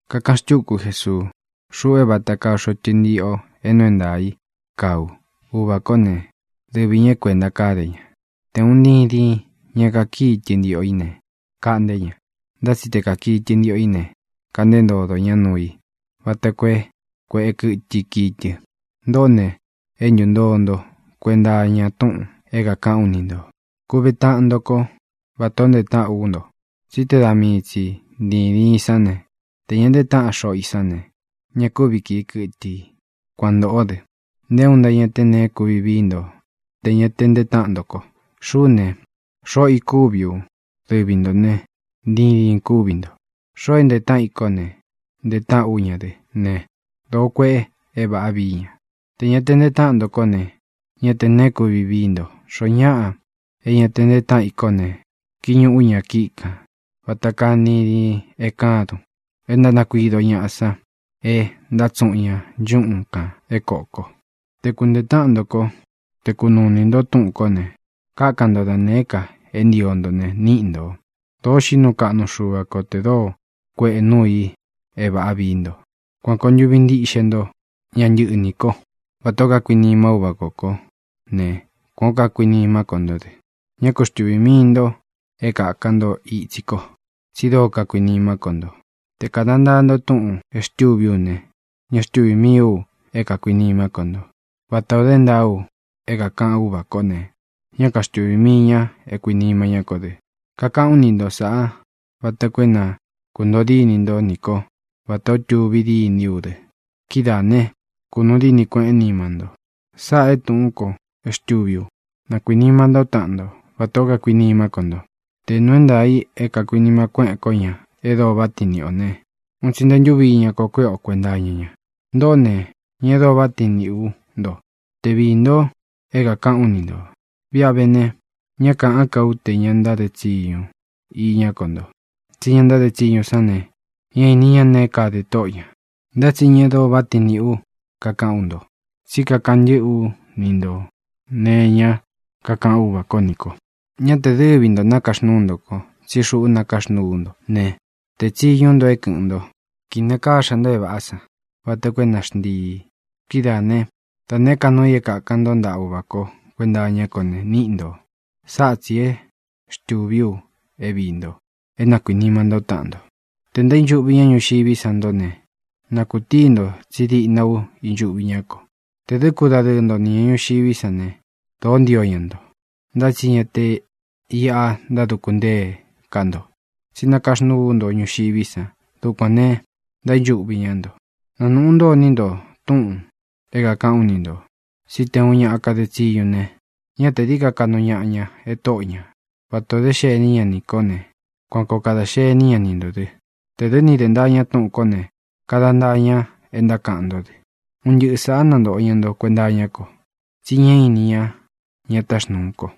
Kakaꞌan xtúku Jesuu: —Xuꞌu é vata kaa xoꞌo tɨntiꞌo é nuu é ntaā i kaá u. Uvā kó ne, dɨvi ñā é kuēnta káde ña. Te ūun ntidin i ña kakíi tɨntiꞌo í ne, kaꞌnté ña. Ntá tsi te kakii tɨntiꞌo í ne, kaꞌnté ntodo ñá nuu i vata koo é kuēꞌe kɨ́tɨ i kii tɨ. Ntoꞌó ne, é ntūntoo nto kuenta iña túꞌūn é kākaꞌán u ni ntō. Kuve taꞌan nto kó vatā ó ntee táꞌan ú nto. Tsí te da mii tsi ntīdin i sán, tē ña ntee táꞌan xoꞌo i sán ne, ña kúvi kīi kɨtɨ i. Kuan ntōꞌó dɨ, nté uun nto ña te neé kuvi vií nto tē ña ntee táꞌan nto ko. ʼXuꞌú ne, xoꞌo i kúvi u; dɨvi ntō né, ntidin ī kúvi nto. Xoo é ntee táꞌan i kó ne, ntee táꞌan ú ña dɨ́ ne, dōó kueꞌe é vāꞌá vií ña. Tē ña te ntee táꞌan nto kó ne, ñá tē neé kuvi vií nto. Xoó ñaꞌa é ña ntee táꞌan i kó ne, kiñuꞌu ña ña kíꞌi kān vata kaa ntidin i e kádun e ntánakuido ñaꞌa san e ntátsuꞌun ña nchúꞌun kān é kōko. ʼTe kunteē táꞌan nto kó, te kunuu inī nto túꞌūn kó ne, kákan nto da nēé ka é ntio nto ne, níꞌi ntō. Dōo xiꞌí nuu kaꞌnu Xuva ko tē dóo kuēꞌe núu i é vāꞌa vií nto. Kuan kōo ntuvi ntíꞌxe nto ña ntɨniꞌī ko. Vatā ó kakuinima Úvā kó ko ne, kuān ó kakuinimá ko ntó dɨ. Ñá ku xtuvī mii nto é kāka nto itsí ko, tsi dóo kakuinimá ko nto. Te kāda ntaa nto túꞌūn é xtūví u ne, ña xtúvī mií u é kākuinimá ko nto, vatā o dé ntaa u é kākaꞌan Úvā kó ne, ñá kaxtuvī mii ña é kākuinima ñá ko dɨ. ʼKakaꞌán u ni nto sāꞌá vata koo é na kūntoo dínī ntó nī kó vatā ó tuvi dîní u dɨ. Kidáā ne, kunuu díni kueꞌén nima nto. Sáꞌā e túꞌūn ko é xtūví u: Na kuīnima ntó taꞌan nto vatā ó kakuinimá ko nto. Te nūu é ntaā i é kākuinima kuéꞌen ko ña e dóo váꞌa tiin niꞌi ō ne, un tsi nte ntúvi iña ko kuéꞌe o kuēnta iña ña. Ntoꞌó ne, ña e dóo váꞌa tiin niꞌī ú nto te viī nto é kākaꞌán u ni ntō. Viꞌi a vé ne, ñá kāꞌán ka u te ña ntáde tsiñu iñá ko nto, tsí ña ntáde tsiñu sán ne, ñá īni ña neé kade tóꞌo ñā. Ntá tsi ña e dóo váꞌa tiin niꞌī ú kakaꞌán u nto, tsí kakaꞌan ntɨ́ꞌɨ ú ni ntō nee iñá kakaꞌan Úvā kó nī ko. Ña te dɨ́vi ntō nakaxnúu ntō ko, tsí xuꞌu nakaxnúu ú nto ne, teé tsiñú u nto é kɨ̄ꞌɨn nto, kinakáxa nto é vāꞌá san vata koo é na xntiī. Kidáā né, da nēé ka nuu i é kākan ntó ntaꞌa Uvā kó kuenta iñá ko ne, níꞌi ntō. Sáꞌa tsī é xtūví u é viī nto: é na kuīnima ntó taꞌan nto. ʼTē ntaínchuꞌvi ñá ñuxiví san ntó ne, na kūtuni nto tsí diꞌna u ínchuꞌvi ñá ko. Tē dɨ́ kudadɨɨ nto nī ña ñuxiví san ne, dōó ntio ña nto. Ntá tsi ña te iꞌa ntáduku ntée ká nto, tsí nakaxnúu ú nto ñuxiví san. Dukuān ne, ntaínchuꞌvi ñá nto. Nanūꞌu ntó iní nto túꞌūn é kākaꞌán u ni ntō: Tsi nté uun ña kade tsiñu ne, ñá tē dií ka kaꞌnu ñaꞌa ña e tóꞌo ñā. Vata ō dé xení ña nī kó ne, kuan kōo kada xení ña ni ntō dɨ. Tē dɨ́ ni dē ntaa ña túꞌūn kó ne, kada ntaa ña e ntákaꞌan ntó dɨ. Un ntɨꞌɨ sāꞌá nantōꞌo ña nto kuenta iñá ko, tsi ñá īni ña ña táxnūu ko.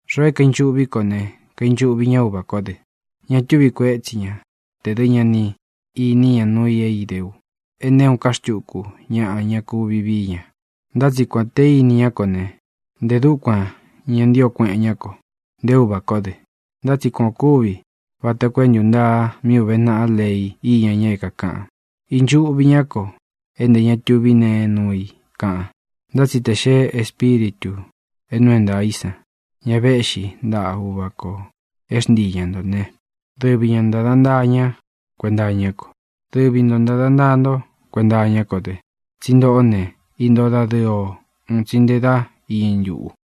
Xoo é kainchuꞌví ko ne, kainchuꞌvi ña Úvā kó dɨ. Ña túvi kuētsí ña tē dɨ́ ña ni īní ña nuu i é idé u e nté uun ká xtuku ñaꞌa ña kuvi vií ña. Ntá tsi kuān te íni ñá ko ne, ntē dúkuan ña ntío kueꞌen ñá ko, nté Uvā kó dɨ. Ntá tsi kuan ō kúvi vata koo é ntūntaa mí ūve naꞌa lei íña ña é kākaꞌan: “Īnchuꞌvi ñá ko é ntē ña tuví nee nuu i”, kaꞌan. ʼNtá tsi tē xee Espíritū é nuu é ntaā í san, ña véꞌxi ntaꞌa Uvā ko é xntii ña ntō né, dɨvi ña ntāda ntaa ña kuenta iñá ko. Dɨvi nto ntāda ntaa nto kuenta iñá ko dɨ, tsí ntoꞌó ne, intóo dadɨɨ ō un tsi nte dá iñɨ ntuꞌu.